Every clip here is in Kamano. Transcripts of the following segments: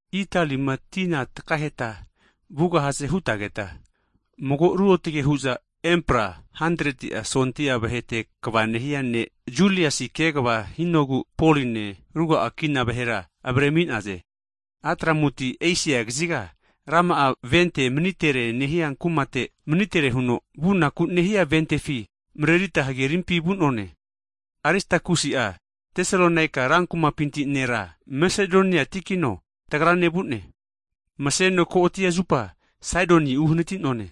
Italima tina takaheta vugahaze hutageta, mago ruotage hu'za empra 100ti'a sondia vahete kva nehia ne' (sensulien) Juliasi kegva hinogu, Poline, ruga'a kina vahera, avaremi'naze. Atramutiti Esia kaziga rama'a vente manitere nehia kumate manitere huno, vunaku nehia ventefi marerita hagerimpi vu'none. Aristakusi'a Tesalonika ra kumapinti nera, Masedoniatikino tagrane vu'ne. Maseno ko'ati zupa Saidon uhanati'none.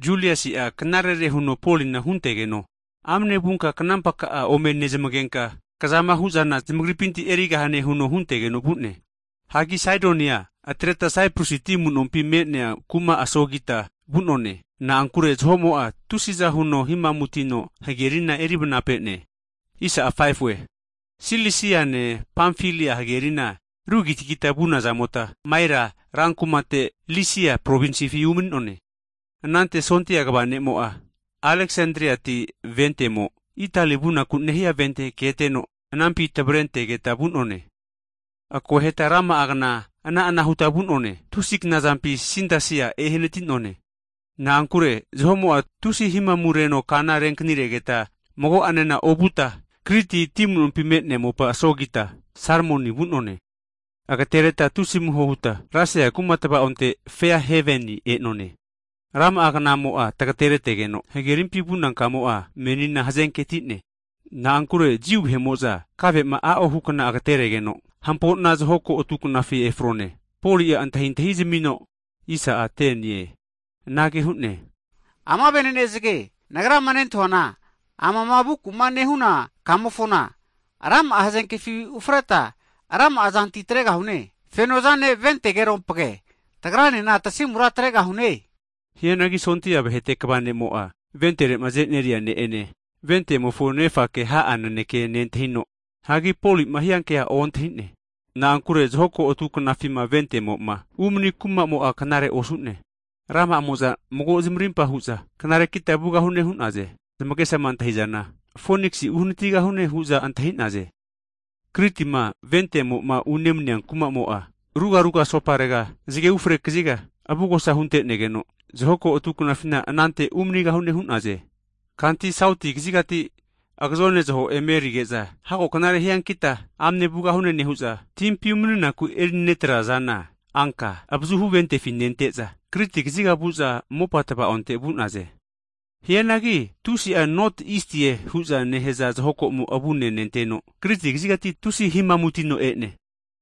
Juliasi'a knarere huno Polina huntegeno, amane vunka knampa ka'a ome nezmagenka, kzama hu'zana zamagripinti erigahane huno huntegeno vu'ne. Hagi Saidonia atreta Siprusi ti amu'nompi me'nea kuma asogita vu'none. Na'ankure zaho'mo'a tusiza huno himamutino hagerina erivnapene. Silisiane Pamfilia hagerina arugitagita vunazamota, Maira rankumate Lisia provinsifi umani'none. Anante sondia kva ne'mo'a Aleksandriati ventemo, Itali vunaku nehia vente keteno, anampi tavare antegeta vu'none. Akoheta rama'a kna ana'ana huta vu'none. Tusi knazampi Sindasia ehanati'none, na'ankure zaho'mo'a tusi himamu reno kana renkaniregeta mago'anena ovuta, Kriti ti amunompi me'nea mopa asogita Salmoni vu'none. Agatereta tusi amuho huta Lasia kuma tavaonte, Fea Haveni e'none. Rama'a knamo'a tagateretegeno, hagerimpi vuna kamo'a menina hazenke atie, na'ankure Jiu vahe'mo'za kave'ma a'o hukna agateregeno, hampo'na zaho ko atu knafi efrone, Poli'a antahintahi zamino, anage hu'ne, ama ve'nene zage, nagrama nentahuana, amama vuku'ma nehuna kamofona rama'a hazenkefi ufreta rama'a zanti atregahune, feno'zane ventegeropage, tagranena tasimura atregahune huno zamasmi'ne. Hianagi sondia vahete kva ne'mo'a, ventere'ma aze'neria ne' ene, ventemofo nefake ha'a nanekea nentahino, hagi Poli'ma hiankea ontahi'ne. Na'ankure zahoko'atu knafima ventemo'ma umani kumamo'a knarera osu'ne. Rama'amo'za mago'zmarimpa hu'za, knarekita vugahune hu'naze. Zamagesama antahizana Foniksi uhanatigahune hu'za antahi'naze. Kritima ventemo'ma unemania kumamo'a rugaruga asoparega zge ufre kaziga (notwest sautwest) avugosa hunte'negeno zaho ko atu knafina anante umanigahune hu'naze. Kanti sauti kazigati agazone zaho emarerige'za, hago knare hiankita amane vugahu'ne nehu'za, timpi umaniku erinetraza zana anka avazuhu ventefi nenteza, Kriti kaziga vu'za mopa tva'onte vu'naze. Hianagi tusi'a not isti'e hu'za nehaza zahokomo avunenenteno Kriti kazigati tusi himamutino e'ne.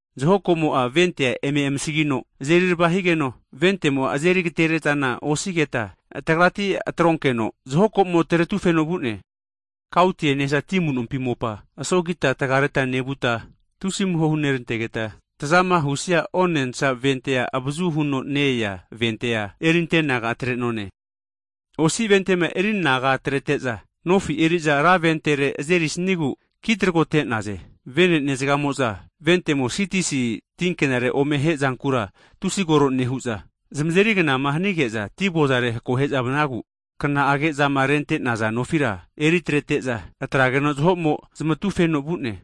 Zaho komo'a vente'a eme amasagino azeri rava higeno, ventemo'a azeri agatere'zana osigeta tagrati atronkeno zaho komo taretufeno vu'ne. Kautie nehaza ti amu'nompi mopa asogita tagareta nevuta, tusi amuho hunerantegeta tazama husia onensa ventea avazu huno ne-ea ventea erinteanaga atre'none. Osi ventema erianaga atrete'za, nofi eri'za ra ventere azerisigu kitragote'naze. Vene'ne zgamo'za ventemo Sitisi tinkenare ome hae'zankura tusi kore nehu'za zamazeri knama hanige'za ti avozare'ma akohe'za vanagu, kna'age'zama rente'naza nofira eritrete'za atrageno zaho'mo zamatufeno vu'ne.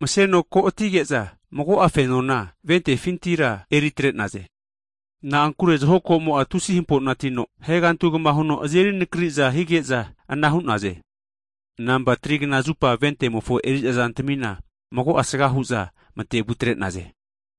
Maseno ko'atige'za mago'a fenona ventefintira eri atre'naze, na'ankure zaho komo'a tusi hampo'natino ahegantugama huno azeri nakari'za hige'za ana hu'naze. Nampa 3knazupa ventemofo eri'za zantamina mago'a asga hu'za mate'vu atre'naze.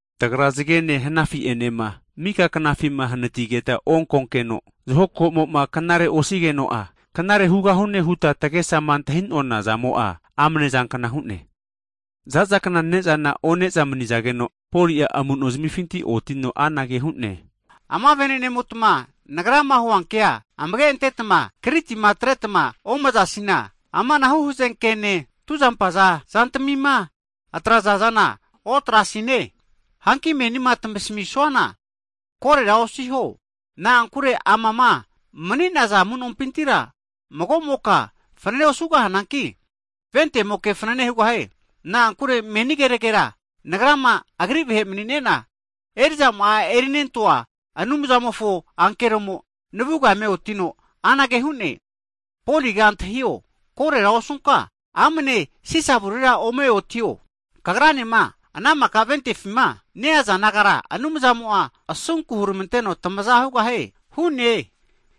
Tagra zagene hanafi'enema mika knafima hanatigeta onkonkeno zahoko'mo'ma knare osigeno'a, knare hugahune huta tagesama antahi'nona zamo'a amane zankna hu'ne. Za'za kna ne'zana one'za manizageno, Poli'a amu'nozamifi otino anage hu'ne, ama vene'nemotma nagrama huanke amage antetma Krititima atretma omazasina amanahu hazenkene tuzampaza zantamima atraza zana otrasine. Hanki menima tamasmisuana korera osiho, na'ankure amama mani'naza amu'nompintira mago'moka fanane osugahananki ventemoke fanane hugahie. Na'ankure meni keragera nagrama Agri vahe mani'nena erizama'a erinentoa Anumzamofo ankeromo'a navuga eme otino, anage hu'ne, Poliga antahio korera osunka amane Sisa avurera ome otio, kagranema ana mika ventefima neaza nagara Anumzamo'a asunku huramanteno tamaza hugahie hu'ne.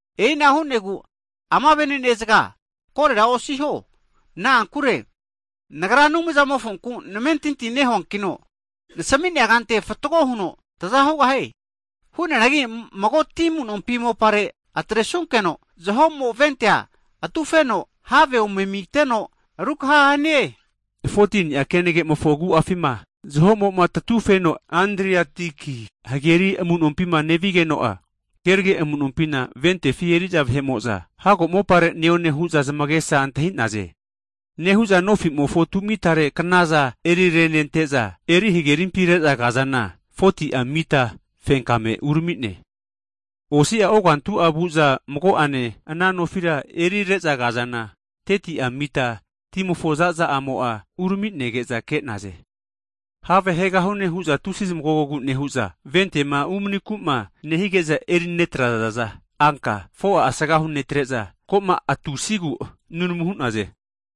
E'inage hu'negu ama vene'nezga korera osiho, na'ankure nagra Anumzamofonku namentinti nehuankino nasami'nea kante fatgo huno taza hugahie. Hu'neanagi mago ti amunompi mopare atresunkeno zaho'mo ventea atufeno have ome amiteno rukaha hanie. 14ni'a kenage'mofo agu'afima zaho'moma tatufeno Adriatiki hageri amu'nompima nevigeno'a, kerage amu'nompina ventefi eri'za vahe'mo'za hago mopare neone hu'za zamagesa antahi'naze. Nehu'za nofi tu'mitare knaza eri renente'za, eri hagerimpi re'za kazana, 40ti'a mita fenkagame urami'ne. Osi'a ogantu'a vuza mago'ane ana nofira erire'za kazana, 30ti'a mita timofo zaza a'mo'a urami'nege'za ke'naze. Have haegahune hu'za tusi zamagogogu nehu'za, ventema umaniku'ma nehige'za erinetrazaza anka 4'a asgahu netre'za, ko'ma atusigu nunamu hu'naze.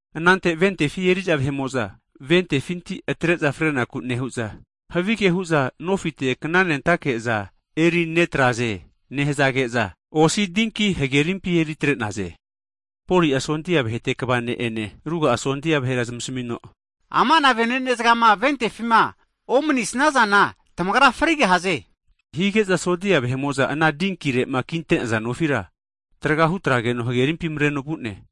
Anante ventefi eri'za vahe'mo'za ventefinti atre'za fre'naku nehu'za, havige hu'za nofite kna'nentake'za eri netraze nehazage'za osi voti hagerimpi eri atre'naze. Poli'a sondia vahete kva ne'ene ruga'a sondia vahera zamasamino, Ama'na vene'ne zgama ventefima omani'snazana tamagra frigahaze hu'ne. Hige'za sondia vahe'mo'za ana dinkire'ma kinte'naza nofira traga hutrageno hagerimpi mareno vu'ne.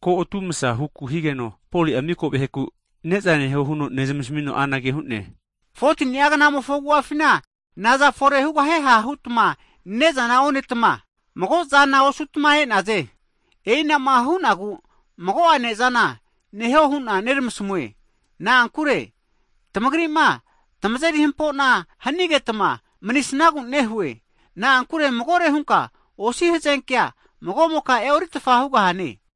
Ko'atumasa huku higeno, Poli'a mika vaheku ne'za neho huno nezmasmino anage hu'ne, 14ni'a kna'mofo agu'afina naza fore hugahieha hutma ne'zama onetma mago'zama osutma e'naze. E'inama hu'nagu mago'a ne'zana neho hu'na neramasmue na'ankure, tamagri'ma tamazeri hampo'na hanigetma manisnagu nehue. Na'ankure magore hunka osi hazenkea mago'moka e'oritfa hugahane.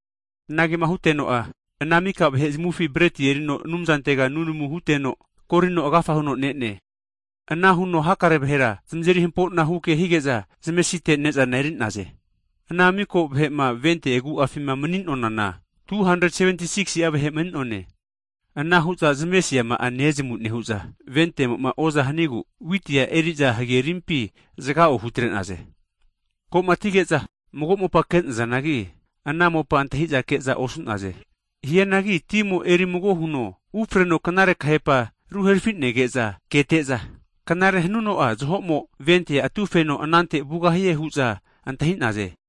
Anagema huteno'a, ana mika vahe'zamufi breti erino Anumzantega nunamu hunteno, korino agafa huno ne'ne. Ana huno hakare vahera zamazeri hampo'na huke hige'za zamesite ne'zana eri'naze. Ana miko vahe'ma vente agu'afima mani'nonana, 276'a vahe mani'none. Anahu'za zamesiama'a nezamu nehu'za, ventemo'ma oza hanigu witi'a eri'za hagerimpi matevu atrenaze. Ko'ma atige'za, mago mopa ke'nazanagi ana mopa antahi'za ke'za osu'naze, hianagi timo eri mago huno ufreno knare kahepa ruherafi'nege'za kete'za, knare hanuno'a zahomo vente'a atufeno anante vugahie hu'za antahi'naze.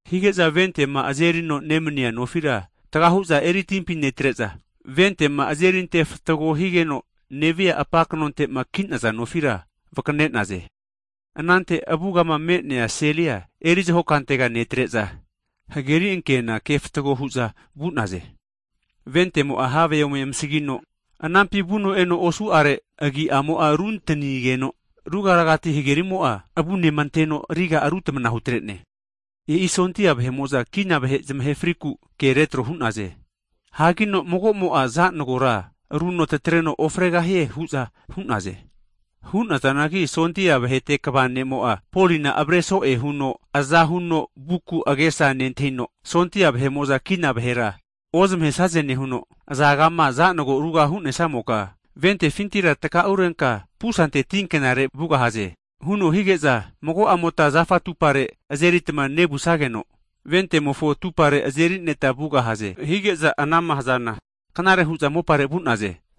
Hige'za vente'ma azerino nemania nofira tgahu'za eri timpi netre'za, ventema azeri ante fatgo higeno nevia apa knonte'ma ki'naza nofira vakane'naze. Anante avugama me'nea selia eri zaho kantega netre'za, hageri ankena kefatago hu'za vu'naze. Ventemo'a have ome amasgino anampi vuno'eno osu'are agi'mo'a runtanigeno, ruga ragati hagerimo'a avunema anteno riga'a rutamana hutre'ne. E'i sondia vahe'mo'za kina vahe zamahe frinaku ke retro hu'naze. Hanki mago'mo'a zanagora aruno tatareno ofregahie hu'za hu'naze. Hu'nazanagi, sondia vahete kva ne'mo'a' Poli'na avare so'e huno aza huno vuku agesa nentahino, sondia vahe'mo'za kina vahera ozmahesaze nehuno, azagama zanago ruga hu'nesamoka ventefintira takaurenka pusante tinkenare vugahaze huno hige'za, mago'amota, zafa atupare azeritma nevusageno, ventemofo atupare aze'nerita vugahaze, hige'za ana'ma hazana knare hu'za mopare vu'naze.